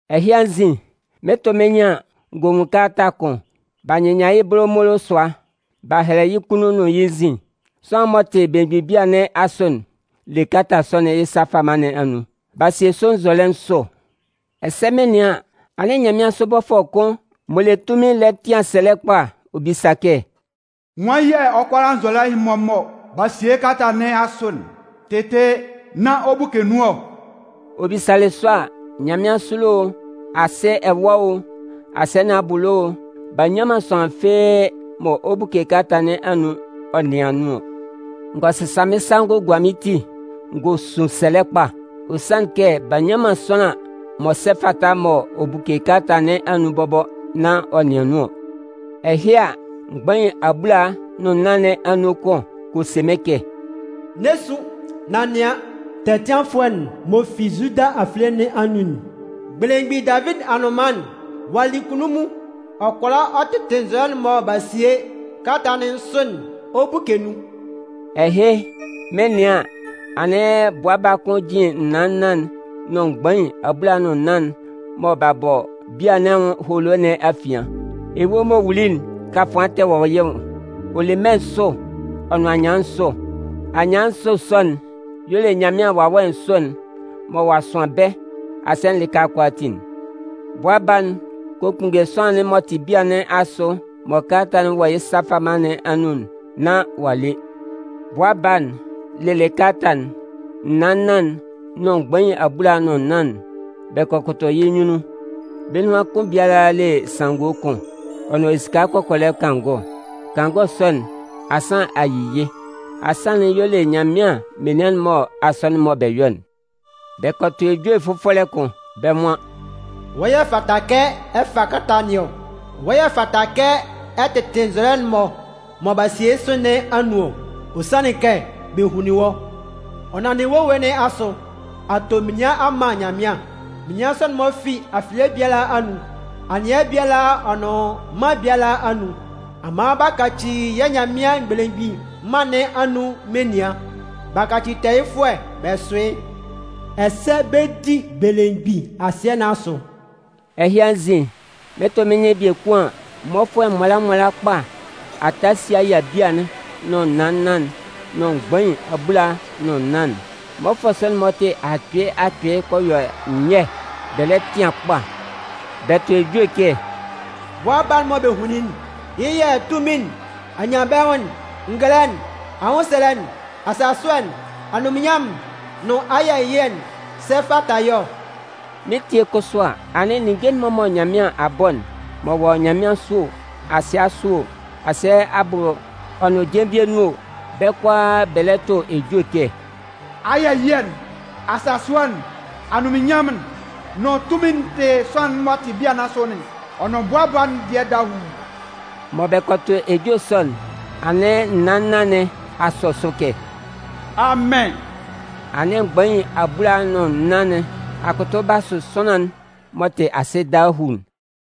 Ɛhɩ anzin, mɩn 'tʋ mɩ́n nyɩn an, n gɔ nwun kalata kʋn, b'a nyɩnnyan yɩ́ bolomolo sʋa. B'a hɛlɛ yɩ́ kunnun nʋn yɩ́ nzin. Sʋanlan'n m'ɔ tɩ belemgbin bia nɩn asʋ'n le kalata sɔ'n yɩ́ sa fama nɩn anun. B'a sie sʋ nzɔlɛ nsʋ, ɛsɛ mɩn 'nɩan an, anɩn nyanmɩansʋ bɔfʋɛ kʋn m'ɔ le tunmin lɛ tɩan sɛlɛ kpa ɔ bisa kɛ: “Nwan yɛ̂ ɔ kʋala nzɔlɛ'n-mɔ mɔ b'a sie yɩ́ kalata nɩn asʋ'n tɩtɩ nán ɔ buke nun ɔ?” Ɔ bisalɩ sɔ a, nyanmɩansʋ ɛlɔ o, asɩ ɛwa o, asɩɛ nɩn abʋ ɛlɔ o b'a nnyan man sʋanlan fɩ́ɩ́ mɔ ɔ 'buke kalata nɩn anun ɔ nɩan nun ɔ. N gɔ sɩsa mɩ́n sa n gɔ gua mɩ́n ti n gɔ sun sɛlɛ kpa. Ɔ sanlɩn kɛ b'a nnyan man sʋanlan m'ɔ sɛ fata mɔ ɔ 'buke kalata nɩn anun bɔbɔ nán ɔ nɩan nun ɔ. Ɛhɩ a, mgbain abulaa nʋn nnan nɩn anun kʋn kɔ se mɩ́n kɛ: “N'ɛ sun, nan nɩan, tɛtɩanfʋɛ'n m'ɔ fi Zuda afilie nɩn anun'n, belemgbin Davidi anʋnman'n, ɔ'a li kunnunmun, ɔ kʋala ɔ tɩtɩ nzɔlɛ'n-mɔ mɔ b'a sie kalata nɩn sʋ'n ɔ buke nun.” Ɛhɩ, mɩn 'nɩan an, anɩn Bʋa Baa kʋn jin naan nnan'n nʋn mgbain abulaa nʋn nnan'n mɔ b'a bɔ bia nɩn anwʋn holo nɩn afian. Ewue'n m'ɔ wuli'n kafʋan tɛ wɔ yɩ́ nwʋn. Ɔ le mmɛ nsʋ ɔ nʋn anyɩan nsʋ. Anyɩan nsʋ sɔ'n y'ɔ le Nyanmɩan Wawɛ nsʋ'n mɔ ɔ'a sʋan bɛ́ asɩɛ'n lɩka kʋalaatin'n. Bʋa Baa'n kɔ kpunnge Sʋanlan'n m'ɔ tɩ bia nɩn asʋ mɔ kalata'n wɔ yɩ́ sa fama nɩn anun'n nán ɔ'a le. Kɛ Bʋa Baa'n lelɩ kalata'n, naan nnan'n nʋn mgbain abulaa nʋn nnan'n, bɛ kɔ kʋtʋ yɩ́ nyunnun. Bɛ́ nunhan kʋn biala le sanngo kʋn, ɔ nʋn esika kɔkɔlɛ kangɔ. Kangɔ sɔ'n, ansan yi yɩ́. Ansan'n y'ɔ le Nyanmɩan menian'n-mɔ asɔnɩn'n mɔ bɛ yɔ'n. Bɛ kɔ tʋ ejue fʋfɔlɛ kʋn, bɛ́ nwan: “Wɔ́ y'ɔ fata kɛ ɛ fa kalata nɩn ɔ. Wɔ́ y'ɔ fata kɛ ɛ tɩtɩ nzɔlɛ'n-mɔ mɔ b'a sie yɩ́ sʋ nɩn anun ɔ. Ɔ sanlɩn kɛ bɛ hunlin wɔ́. Ɔ nanndɩ wɔ́ ewue nɩn asʋ, a to menian a man Nyanmɩan. Menian sɔ'n-mɔ fi afilie biala anun, anɩɛ biala ɔ nʋn mân biala anun. A man b'a kaci yɛ́ Nyanmɩan'n Belemgbin Mân nɩn anun menian b'a kaci tɛɛyɩfʋɛ bɛ sʋ yɩ́. Ɛsɛ bɛ 'di belemgbin asɩɛ nɩn asʋ.” Ɛhɩ anzin, mɩn 'tʋ mɩ́n nyɩn biekun an, mmɔfʋɛ nwala nwala kpa a ta a si a yia bia'n nʋn naan nnan'n nʋn mgbain abulaa nʋn nnan'n. Mmɔfʋɛ sɔ'n-mɔ tɩ akpɩɩ akpɩɩ kɔ yɔ nyɛ bɛ lɛ tɩan kpa bɛ tʋ ejue kɛ: “Bʋa Baa'n mɔ bɛ hunlin yɩ́'n, yɩ́ yɛ̂ tunmin'n, anyanbɛnwʋn'n, ngɛlɛ'n, anwʋnsɛlɛ'n, asasʋɛ'n, anunminnyanmʋn'n nʋn ayɛ ɛyɩɛ'n sɛ fata yɩ́ ɔ.” Mɩn 'tie kʋsʋ a, anɩn ninnge'n-mɔ mɔ Nyanmɩan a bɔ'n, m'ɔ wɔ nyanmɩansʋ o, asɩɛ asʋ o, asɩɛ abʋ ɔ nʋn jenvie nun o, bɛ́ kʋalaa bɛ lɛ tʋ ejue kɛ: “Ayɛ ɛyɩɛ'n, asasʋɛ'n, anunminnyanmʋn'n nʋn tunmin'n tɩ Sʋanlan'n m'ɔ tɩ bia nɩn asʋ'n ɔ nʋn Bʋa Baa'n dɩɛ dahuu!” Mɔ bɛ kɔ tʋ ejue sɔ'n, anɩn naan nnan nɩn a sɔ sʋ kɛ: “Amɩn!” Anɩn mgbain abulaa nʋn nnan nɩn a kʋtʋ b'a sʋ Sʋanlan'n m'ɔ tɩ asɩ dahuu'n.